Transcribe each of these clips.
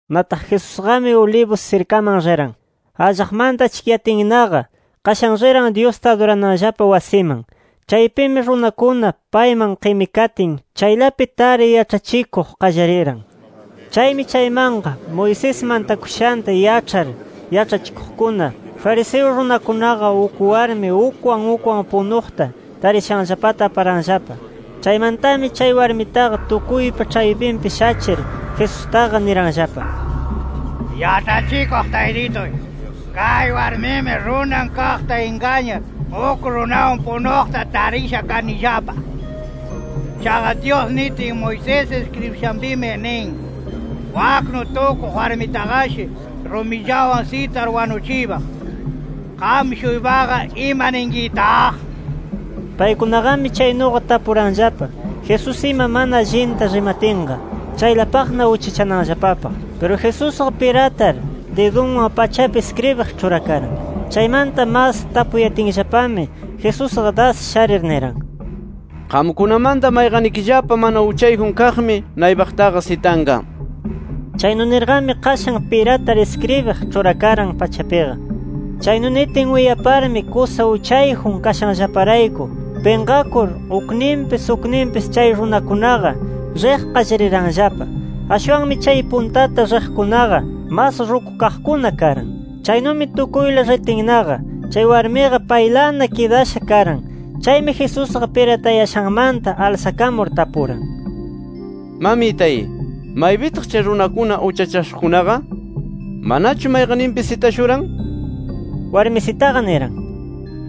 Nataq Jesusqami Olivos sirkaman riran. Allaqmanta achkiyatinnaqa qashan riran Dyusta adurananllapa wasiman. Chaypimi runakuna payman qimikatin, chaylapi tar yaĉhachikuq qallariran. Chaymi chaymanqa, Moisés mantakushanta yaĉhar yaĉhachikuqkuna, fariseo runakunaqa uk warmi ukwan ukwan punuqta tarishanllapata aparanllapa. Chaymantami chay warmitaqa tukuypa ĉhaypinpi shachir, Jesustaqa niranllapa: —Yaĉhachikuq Taytituy, kay warmimi runan kaqta ingañar, uk runawan punuqta tarisha kanillapa. Chaqa Dyus nitin Moisés iskribishanpimi nin: Waknu tukuq warmitaqashi rumillawan sitar wanuchiypaq. ¿Qam-shuypaqa ima ninkitaq? nir. Paykunaqami chaynuqa tapuranllapa Jesús ima mana allinta rimatinqa, chaylapaqna uchachananllapapaq. Piru Jesusqa piratar didunwan pachapi iskribiq ĉhurakaran. Chaymanta mas tapuyatinllapami, Jesusqa das sharir niran: —Qamkunamanta mayqannikillapa mana uchayjun kaqmi naypaqtaqa sitanqa nir. Chaynu nirqami, qashan piratar iskribiq ĉhurakaran pachapiqa. Chaynu nitin uyaparmi, kusa uchayjun kashanllaparayku pinqakur ukninpis ukninpis chay runakunaqa riq qallariranllapa. Ashwanmi chay puntata riqkunaqa mas rukukaqkuna karan. Chaynumi tukuyla ritinnaqa chay warmiqa paylana kidasha karan. Chaymi Jesusqa, piratayashanmanta alsakamur tapuran: —Mamitay, ¿maypitaq chay runakuna uchachashuqkunaqa? ¿Manachu mayqanninpis sitashuran? nir. Warmisitaqa niran: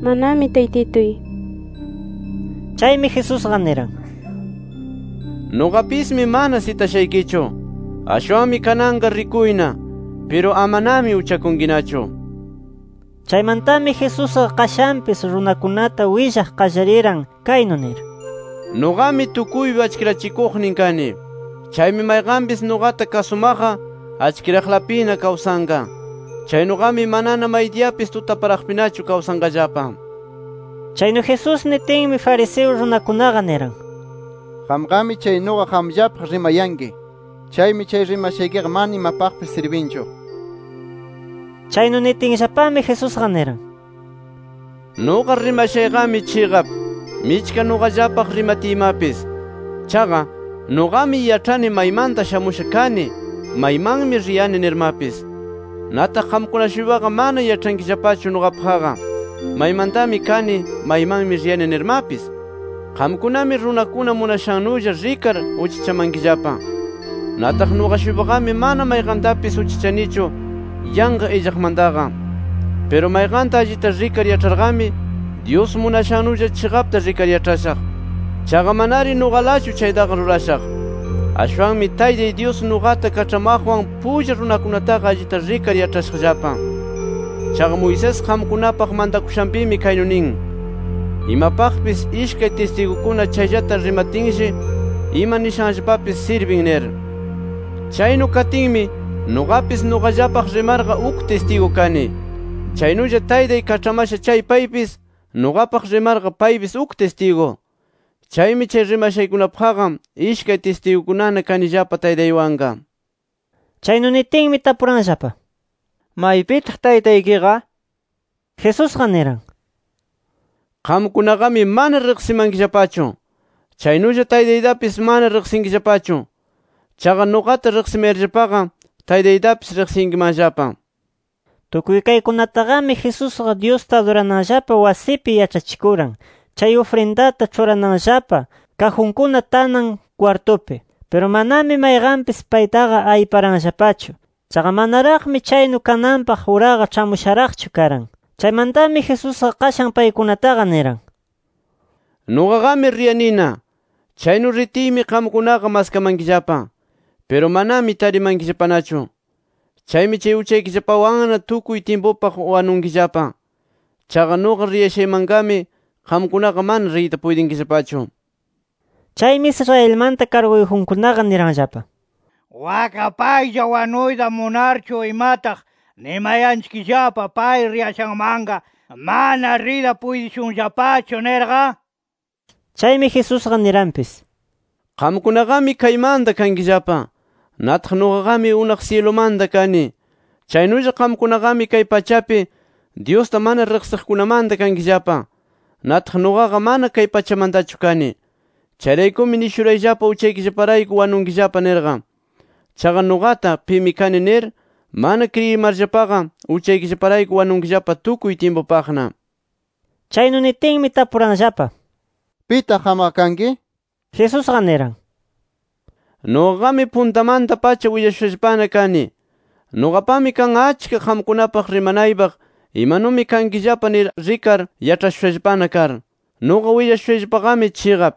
—Manami Taytituy. Chaymi Jesusqa niran: —Nuqapismi mana sitashaykichu. Ashwanmi kananqa rikuyna. Piru amanami uchakunkinachu nir. Chaymantami Jesusqa qashanpis runakunata willaq qallariran kaynu nir: —Nuqami tukuypa achkirachikuqnin kani. Chaymi mayqanpis nuqata kasumaqqa, achkiraqlapina kawsanqa. Chaynuqami manana maydiyapis tutaparaqpinachu kawsanqallapa. Chaynu Jesús nitinmi, fariseo runakunaqa niran: —Qamqami chaynuqa qamllapaq rimayanki. Chaymi chay rimashaykiqa mana imapaqpis sirbinchu nir. Chaynu nitinllapami, Jesusqa niran: —Nuqa rimashayqami chiqap, michka nuqallapaq rimatiymapis. Chaqa, nuqami yaĉhani maymanta shamusha kani, maymanmi riyani nirmapis. Nataq qamkuna-shuypaqa mana yaĉhankillapachu nuqapaqqa, maymantami kani, maymanmi riyani nirmapis. Qamkunami runakuna munashannulla rikar uchachamankillapa. Nataq nuqa-shuypaqami mana mayqantapis uchachanichu yanqa illaqmantaqa. Piru mayqanta allita rikar yaĉharqami, Dyus munashannulla chiqapta rikar yaĉhashaq. Chaqa manari nuqalachu chaytaqa rurashaq. Ashwanmi Taytay Dyus nuqata kaĉhamaqwan pulla runakunataqa allita rikar yaĉhashaqllapa. Chaqa Moisés qamkunapaq mantakushanpimi kaynu nin: ‘Imapaqpis ishkay tistigukuna chayllata rimatinshi ima nishanllapapis sirbin’ nir. Chaynu katinmi, nuqapis nuqallapaq rimarqa, uk tistigu kani. Chaynulla Taytay kaĉhamasha chay paypis, nuqapaq rimarqa paypis uk tistigu. Chaymi chay rimashaykunapaqqa, ishkay tistigukunana kanillapa Taytaywanqa nir. Chaynu nitinmi tapuranllapa: —¿Maypitaq Taytaykiqa? nir. Jesusqa niran: —Qamkunaqami mana riqsimankillapachu. Chaynulla Taytaytapis mana riqsinkillapachu. Chaqa nuqata riqsimayarllapaqa, Taytaytapis riqsiyankimanllapa nir. Tukuy kaykunataqami Jesusqa Dyusta adurananllapa wasipi yaĉhachikuran, chay ufrindata ĉhurananllapa kajunkuna tanan kwartupi. Piru, manami mayqanpis paytaqa ayparanllapachu. Chaqa manaraqmi chaynu kananpaq uraqa ĉhamusharaqchu karan. Chaymantami Jesusqa qashan paykunataqa niran: —Nuqaqami riyanina. Chaynu ritiymi qamkunaqa maskamankillapa. Piru manami tarimankillapanachu. Chaymi chay uchaykillapallawanna tukuy tyimpupaq wanunkillapa. Chaqa nuqa rishaymanqami qamkunaqa mana riyta puytinkillapachu nir. Chaymi Israelmanta karguyjunkunaqa niranllapa: —¿Wakqa paylla wanuyta munarchu imataq nimayanchikllapa pay riyashanmanqa mana riyta puytishunllapachu, nirqa? nir. Chaymi Jesusqa niranpis: —Qamkunaqami kaymanta kankillapa. Nataq nuqaqami unaq syilumanta kani. Chaynulla qamkunaqami kay pachapi, Dyusta mana riqsiqkunamanta kankillapa. Nataq nuqaqa mana kay pachamantachu kani. Chayraykumi nishurayllapa uchaykillaparayku wanunkillapa nirqa. Chaqa nuqata ‘Pimi kani’ nir, mana kriyimarllapaqa, uchaykillaparayku wanunkillapa tukuy tyimpupaqna nir. Chaynu nitinmi, tapuranllapa: —¿Pitaq qamqa kanki? nir. Jesusqa niran: —Nuqaqami puntamanta-pacha willashushallapana kani. Nuqapami kan achka qamkunapaq rimanaypaq, imanumi kankillapa nir rikar yaĉhashushallapana kar. Nuqa willashushayllapaqami chiqap.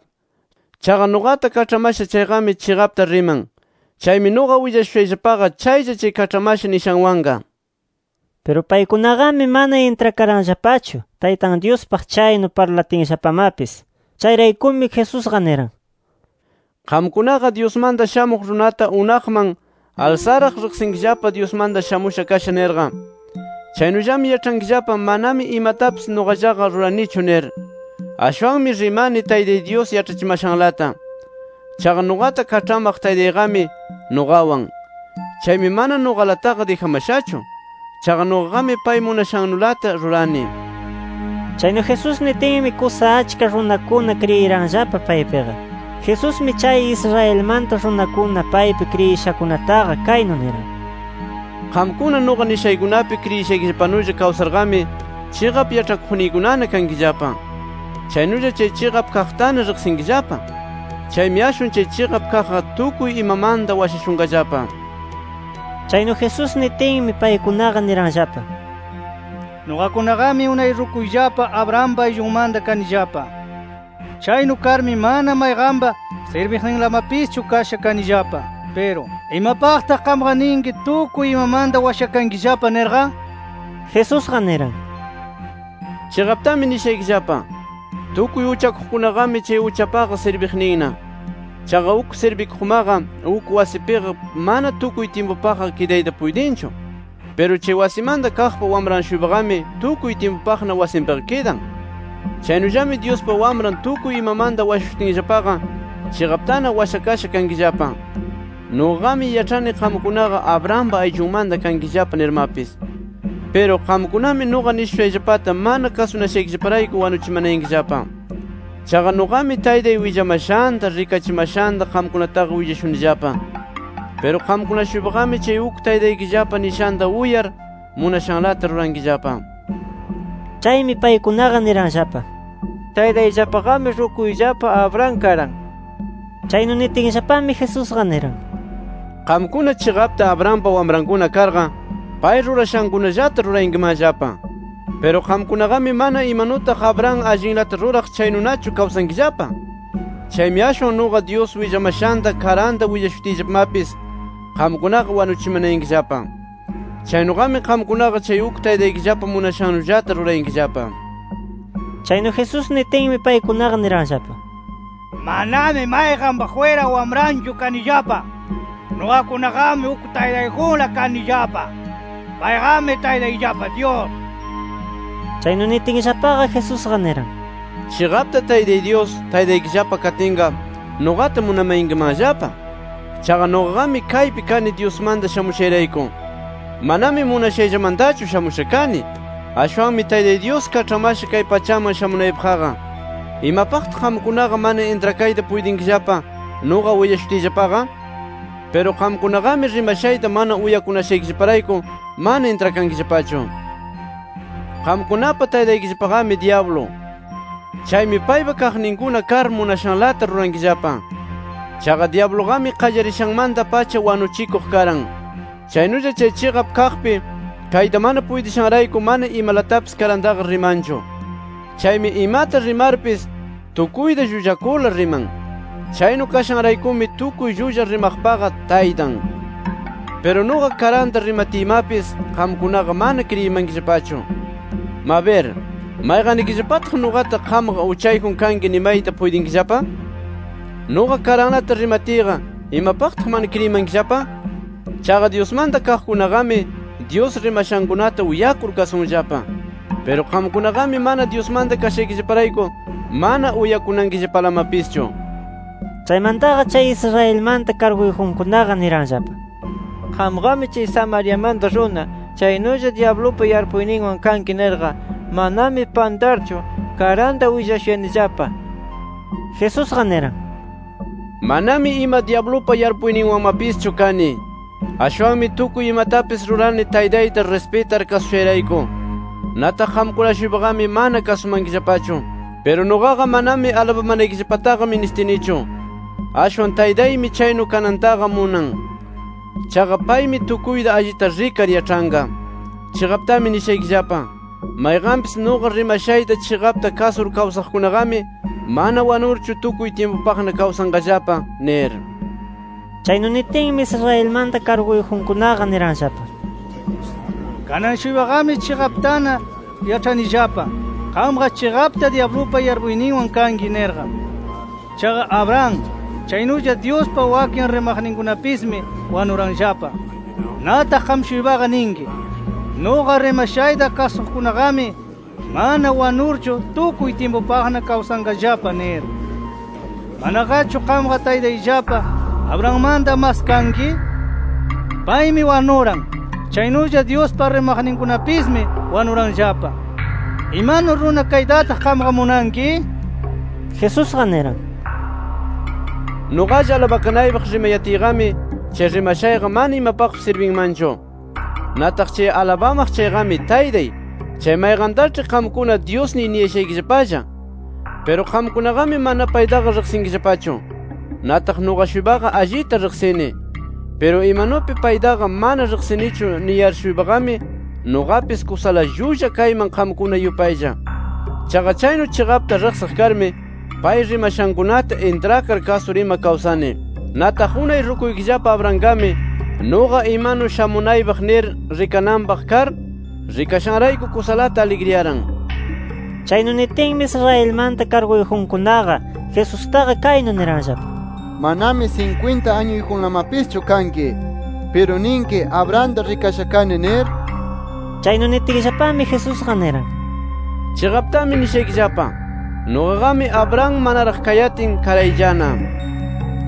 Chaqa nuqata kaĉhamasha chayqami, chiqapta riman. Chaymi nuqa willashushayllapaqa, chaylla chay kaĉhamasha nishanwanqa nir. Piru paykunaqami, mana intrakaranllapachu Taytan Dyuspaq chaynu parlatinllapamapis. Chayraykumi Jesusqa niran: —Qamkunaqa, Dyusmanta Shamuq Runata unaqman alsaraq, riqsinkillapa Dyusmanta shamusha kasha nirqa. Chaynullami yaĉhankillapa manami imatapis nuqallaqa ruranichu nir. Ashwanmi rimani Taytay Dyus yaĉhachimashanlata. Chaqa nuqata kaĉhamaq Taytayqami, nuqawan. Chaymi, mana nuqalataqa dijamashachu. Chaqa nuqaqami pay munashannulata rurani nir. Chaynu Jesús nitinmi, kusa achka runakuna kriyiranllapa paypiqa. Jesusmi chay Israelmanta runakuna paypi kriyishakunataqa kaynu niran: —Qamkuna, nuqa nishaykunapi kriyishaykillapanulla kawsarqami, chiqap yaĉhakuqniykunana kankillapa. Chaynulla chay chiqap kaqtana riqsinkillapa. Chaymi ashwan chay chiqap kaqqa tukuy imamanta washashunqallapa. Chaynu Jesús nitinmi, paykunaqa niranllapa: —Nuqakunaqami unay rukuyllapa Abrahampa ayllunmanta kanillapa. Chaynu karmi mana mayqanpa sirbiqninlamapischu kasha kanillapa. Piru, ¿imapaqtaq qamqa ninki tukuy imamanta washakankillapa nirqa? Jesusqa niran: —Chiqaptami nishaykillapa: Tukuy uchakuqkunaqami chay uchapaqa sirbikuqninna. Chaqa uk sirbikuqmaqa uk wasipiqa mana tukuy tyimpupaqqa kidayta puytinchu. Piru chay wasimanta kaqpa wamran-shuypaqami, tukuy tyimpupaqna wasinpiqa kidan. Chaynullami Dyuspa Wamran tukuy imamanta washashutinllapaqa, chiqaptana washakasha kankillapa. Nuqaqami yaĉhani qamkunaqa Abrahampa ayllunmanta kankillapa nirmapis. Piru, qamkunami nuqa nishushayllapata mana kasunashaykillaparayku wanuchimanayankillapa. Chaqa nuqami, Taytay willamashanta, rikachimashanta qamkunataqa willashunillapa. Piru qamkuna-shuypaqami chay uk taytaykillapa nishanta uyar, munashanlata rurankillapa nir. Chaymi, paykunaqa niranllapa: —¡Taytayllapaqami rukuyllapa Abraham karan! Chaynu nitinllapami Jesusqa niran: —Qamkuna chiqapta Abrahampa wamrankuna karqa, pay rurashankunallata rurayankimanllapa. Piru qamkunaqami manana imanutaq Abraham allinlata ruraq chaynunachu kawsankillapa. Chaymi ashwan nuqa, Dyus willamashanta karanta willashutiyllapamapis qamkunaqa wanuchimanayankillapa. Chaynuqami qamkunaqa chay uk taytaykillapa munashannullata rurayankillapa nir. Chaynu Jesús nitinmi, paykunaqa niranllapa: —Manami mayqanpa jwira wamranchu kanillapa. Nuqakunaqami uk Taytayjunla kanillapa. ¡Payqami Taytayllapa Dyus! nir. Chaynu nitinllapaqa, Jesusqa niran: —Chiqapta Taytay Dyus, taytaykillapa katinqa, nuqata munamayankimanllapa. Chaqa nuqaqami kaypi kani Dyusmanta shamushayrayku. Manami munashayllamantachu shamusha kani. Ashwanmi Taytay Dyus kaĉhamasha kay pachaman shamunaypaqqa. ¿Imapaqtaq qamkunaqa mana intrakayta puytinkillapa nuqa willashutiyllapaqa? Piru qamkunaqami rimashayta mana uyakunashaykillaparayku, mana intrakankillapachu. Qamkunapa taytaykillapaqami dyablu. Chaymi, paypa kaqninkuna kar munashanlata rurankillapa. Chaqa dyabluqami qallarishanmanta-pacha wanuchikuq karan. Chaynulla chay chiqap kaqpi kayta mana puytishanrayku, mana imalatapis karantaqa rimanchu. Chaymi imata rimarpis tukuyta llullakurla riman. Chaynu kashanraykumi tukuy llulla rimaqpaqa taytan. “Piru nuqa karanta rimatiymapis, qamkunaqa mana kriyimankillapachu. Mabir ¿mayqannikillapataq nuqata qamqa uchayjun kanki nimayta puytinkillapa? Nuqa karanlata rimatiyqa, ¿imapaqtaq mana kriyimankillapa? Chaqa Dyusmanta kaqkunaqami, Dyus rimashankunata uyakur kasunllapa. Piru qamkunaqami mana Dyusmanta kashaykillaparayku, mana uyakunankillapalamapischu”. Chaymantaqa chay Israelmanta karguyjunkunaqa niranllapa: —Qamqami chay Samariamanta runa, chaynulla dyablupa yarpuyninwan kanki nirqa, manami pantarchu karanta willashuyanillapa. Jesusqa niran: —Manami ima dyablupa yarpuyninwanmapischu kani. Ashwanmi tukuy imatapis rurani Taytayta rispitar kasushayrayku. Nataq qamkuna-shuypaqami mana kasumankillapachu. Piru nuqaqa manami alabamanaykillapataqa ministinichu. Ashwan Taytaymi chaynu kanantaqa munan. Chaqa Paymi tukuyta allita rikar yaĉhanqa. Chiqaptami nishaykillapa: Mayqanpis nuqa rimashayta chiqapta kasur kawsaqkunaqami mana wanurchu tukuy tyimpupaqna kawsanqallapa nir. Chaynu nitinmi, Israelmanta karguyjunkunaqa niranllapa: —Kanan-shuypaqami chiqaptana yaĉhanillapa qamqa chiqapta dyablupa yarpuyninwan kanki nirqa. Chaqa Abraham, chaynulla Dyuspa wakin rimaqninkunapismi wanuranllapa. Nataq qam-shuypaqa ninki: ‘Nuqa rimashayta kasuqkunaqami mana wanurchu tukuy tyimpupaqna kawsanqallapa’ nir. ¿Manaqachu qamqa taytayllapa Abrahammanta mas kanki? Paymi wanuran. Chaynulla Dyuspa rimaqninkunapismi wanuranllapa. ¿Imanu runa kaytataq qamqa munanki? nir. Jesusqa niran: —Nuqalla alabakanaypaq rimayatiyqami, chay rimashayqa mana imapaqpis sirbinmanchu. Nataq chay alabamaq chayqami Taytay, chay mayqantaĉhi qamkuna Dyusniy niyashaykillapalla. Piru qamkunaqami mana paytaqa riqsinkillapachu. Nataq nuqa-shuypaqa allita riqsini. Piru imanupi paytaqa mana riqsinichu niyar-shuypaqami, nuqapis kusala llulla kayman qamkuna yupaylla. Chaqa chaynu chiqapta riqsiq karmi, pay rimashankunata intrakar kasur ima kawsani. Nataq unay rukuykillapa Abrahamqami nuqa imanu shamunaypaq nir rikananpaq kar, rikashanrayku kusalata aligriyaran nir. Chaynu nitinmi, Israelmanta karguyjunkunaqa, Jesustaqa kaynu niranllapa: —Manami sinkwinta añuyjunlamapischu kanki. ¿Piru ninki Abrahamta rikasha kani nir? Chaynu nitinllapami, Jesusqa niran: —Chiqaptami nishaykillapa: Nuqaqami Abraham manaraq kayatin, karayllana nir.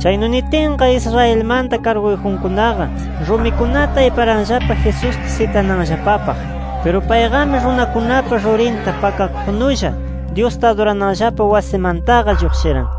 Chaynu nitinqa, Israelmanta karguyjunkunaqa rumikunata ayparanllapa Jesusta sitananllapapaq. Piru payqami runakunapa rurinta pakakuqnulla Dyusta adurananllapa wasimantaqa lluqshiran.